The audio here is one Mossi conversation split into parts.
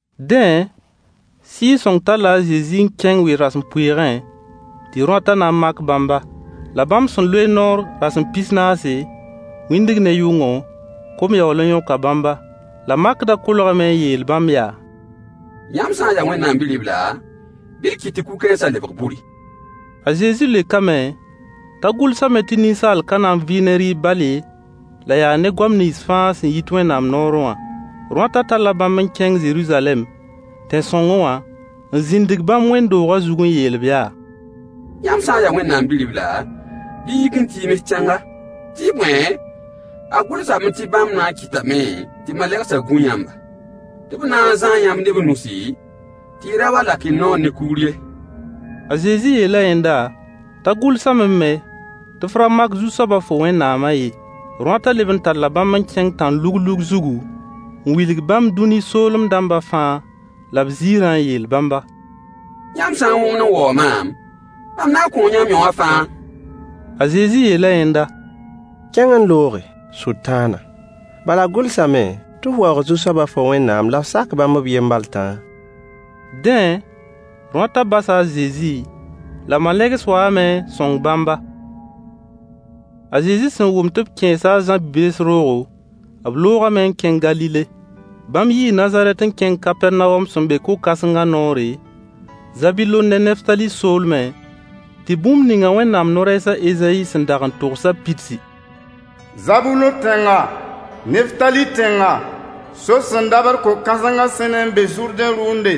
Dẽ, Sɩɩg-sõng talla a Zezi n kẽng we-rasempʋɩɩgẽrõatã na n mak bãmba. La bãmb sẽn loe noor rasem pis-naase, wĩndg ne yʋngo, kom yaool n yõka bãmba. La makdã kolgame n yeel bãmb yaa: Yãmb sã n yaa Wẽnnaam Bi-ribla, bɩ y kɩt tɩ kug-kãensã lebg buri. A Zezi leokame t'a gʋlsame tɩ ninsaal ka na n vɩ ne rɩɩb bal ye, la yaa ne goam nins fãa sẽn yit Wẽnnaam noorẽ wã. Rõatã talla bãmb n kẽng Zeruzalɛm, tẽn-sõngẽ wã, n zĩndg bãmb Wẽnd-doogã zug n yeel-b yaa: Yãmb sã n yaa Wẽnnaam Bi-ribla, bɩ y yɩk n tiims tẽnga, tɩ bõe, a gʋlsame tɩ bãmb na n kɩtame tɩ b malegsã gũ yãmba, tɩ b na n zãa yãmb ne b nusi, tɩ y ra wa n lak y naoor ne kugr ye. A Zezi yeela yẽnda t'a gʋlsame me tɩ f ra mak Zu-soaba fo Wẽnnaamã ye. Rõatã leb n talla bãmb n kẽng tãn-luglug zugu, n wilg bãmb dũni soolem dãmba fãa la b ziirã n yeel bãmba: Yãmb sã n wõgemd n waoog maam, mam na n kõo yãmb yõ wã fãa. A Zezi yeela yẽnda: Kẽng n looge, Sʋtãana! Bala a gʋlsame tɩ f waoog Zu-soabã fo Wẽnnaamã la f sak bãmb b yen bal tãa. Dẽ, rõatã basa a Zezi, la malegs waame n sõng bãmba. A Zezi sẽn wʋm tɩ b kẽesa a Zã bi-bees roogo, b loogame n kẽng Galile. Bãmb yii Nazarɛt n kẽng Kapɛrnawom sẽn be ko-kãsengã noore, Zabulon ne Neftali soolmẽ, tɩ bũmb ninga Wẽnnaam no-rɛɛs a Ezayi sẽn dag n togsã pidsi: Zabulon tẽnga, Neftali tẽnga, sor sẽn dabd ko-kãsengã sẽne n be Zʋrdẽ rʋʋnde,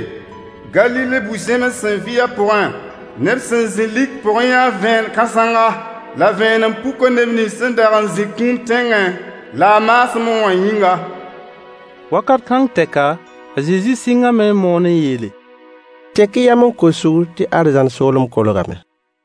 Galile, bu-zẽms sẽn vɩ a pʋgẽ, neb sẽn zĩ lik pʋgẽ yãa vẽen-kãsenga, la vẽenem puka neb nins sẽn dag n zĩ kũum tẽngẽ la a maasmẽ wã yĩnga. Wakat kãng tɛka, a Zezi sɩngame n moon n yeele: Tek-y yam n kos sugr tɩ arzãn soolem kolgame.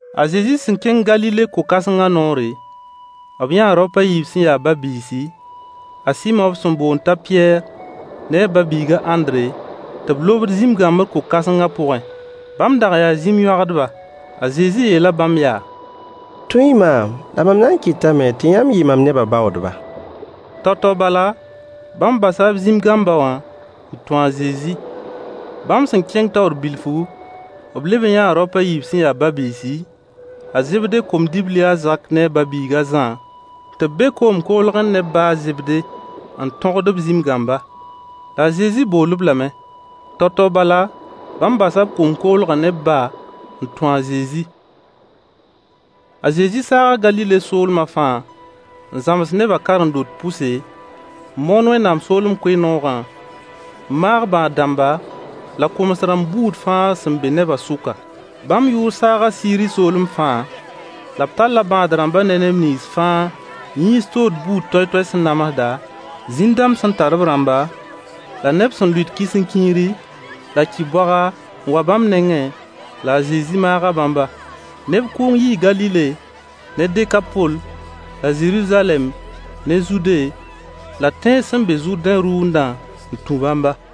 A Zezi sẽn kẽng Galile ko-kãsengã noore, b yãa raop a yiib sẽn ya ba-biisi, a Sɩmo b sẽn boond t'a Pɩyɛɛr ne a ba-biig a Ãndre, tɩ b lobd zĩm-gãmbr ko-kãsengã pʋgẽ. Bãmb dag n yaa zĩm-yõagdba. A Zezi yeela bãmb yaa: Tũ-y maam la mam na n kɩtame tɩ yãmb yɩ mam nebã baoodba. Tao-tao bala bãmb basa b zĩm-gãmbã n tũ a Zezi. Bãmb sẽn kẽng taoor bilfu, b leb n yãa raop a yiib sẽn ya ba-biisi, a Zebde kom-dibli a Zak ne a ba-biig a Zã tɩ b be koom koglgẽ ne b ba a Zebde n tõgd b zĩm-gãmba. La a Zezi bool-b lame. Tao-tao bala, bãmb basa b koom-koglgã ne b ba n tũ a Zezi. A Zezi saaga Galile soolmã fãa n zãms nebã karen-dot pʋse, n moon Wẽnnaam soolem koe-noogã, n maag bãad-rãmba la koms-rãmb buud fãa sẽn be neba sʋka. Bãmb yʋʋr saaga Siiri soolem fãa, la b talla bãad-rãmba ne neb nins fãa yĩns tood buud toay-toay sẽn namsda, zĩn sẽn tar b rãmba, la neb sẽn lʋɩt kisĩnkiiri, la ki-boaga n wa bãmb nengẽ, la a Zezi maaga bãmba. Neb kʋʋng yii Galile ne Dekapol la Zeruzalɛm ne Zude la tẽns sẽn be Zʋrdẽ rʋʋndã n tũ bãmba.